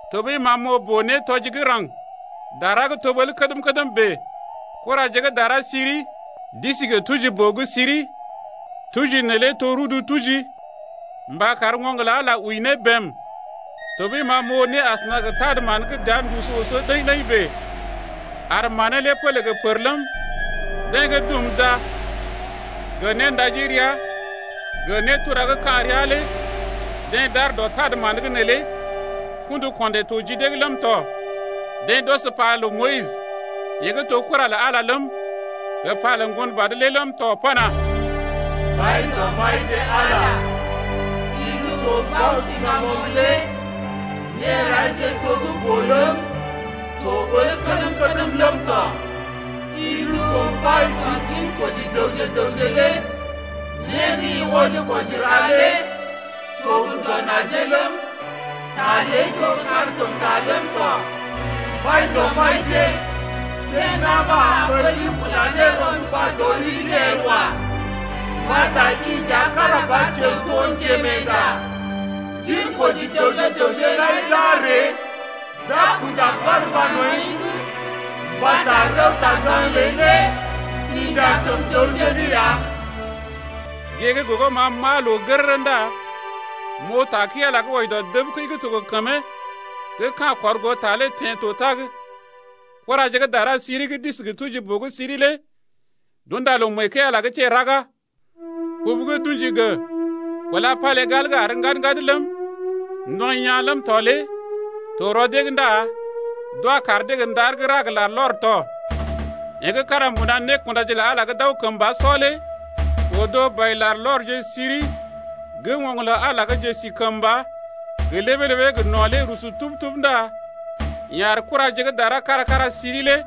Tɔɓəi ma m’oo boo-nétɔji gə́ raŋg dara gə́ to ɓəl kədm-kədm bèe: Kuraje gə́ dara siri d’isi gə tuji-boo gə́ siri, tuji neelé to rudu tuji ɓa mba kar oŋg lə Ala wəi ne bém. Tɔɓəi ma m’oo né asəna gə tad-mán gə́ dəa ndusu oso ɗəḭ-ɗəḭ bèe ar manee lé pélé gə́ pər ləm, deḛ gə́ dum da gə néndaji ria gə nétura gə́ ka̰ ria lé deḛ d’aar dɔ tad-mán’g neelé kṵdu-ko̰dè to ji dee’g ləm tɔ. Deḛ d’ɔs pa lə Moyis, yeḛ gə́ to kura lə Ala ləm, gə pa lə Ŋgonbad lé ləm tɔ pana: Mbaidɔmbaije Ala, i gə́ to Bao-siŋgamoŋ lé Néraije to gə́ boo ləm, to ɓəl kədm-kədm ləm tɔ. I gə́ to mbai dɔ ginkoji dəwje gə raŋg lé Né gə́ i wɔji-kwɔji ra lé to gə dɔ najee ləm, Ta ləi to gə́ kankəmta ləm tɔ, Mbaidɔmbaije, see na̰ ɓa a ɓəli kula ne rɔnduba dɔ rii’g el wa. Mbata i nja kára ba kiao to njerɔkunda. Ginkoji dəwje gə raŋg lai d’a ree d’a kunda barmba nɔḭ’g, Mbata rəwta-gaŋg ləi lé inja kəm dəwje’g ya. Gée gə́ gogo m’aa loo gərərə ndá m’oo ta kəi-Ala gə́ wɔji dɔ dəb kəi gə́ to gə kəmee gə́ ka̰ kɔr goo ta lé teḛ to tag. Kuraje gə́ dara gə́ siri gə́ d’isi gə tuji-boo gə́ siri lé d’unda loo mee kəi-Ala’g teḛ raga. Kubu gə́ d’ṵji gə kúla palégal gə́ àr ŋgad-ŋgad ləm, ndɔḭ yaa̰ ləm tɔ lé to rɔ dee’g ndá d’wa kaar dee gə ndar gə́ ra gə larlɔr tɔ. Yeḛ gə́ kára mbuna nékundaje’g lə Ala gə́ d’aw kəmba sɔ lé odo bai-larlɔrje siri gə́ oŋg lə Ala gə́ njesikəmba gə ləbee-ləbee gə no̰ lé rusu tub-tub ndá yeḛ ar kuraje gə́ dara kára-kára siri lé.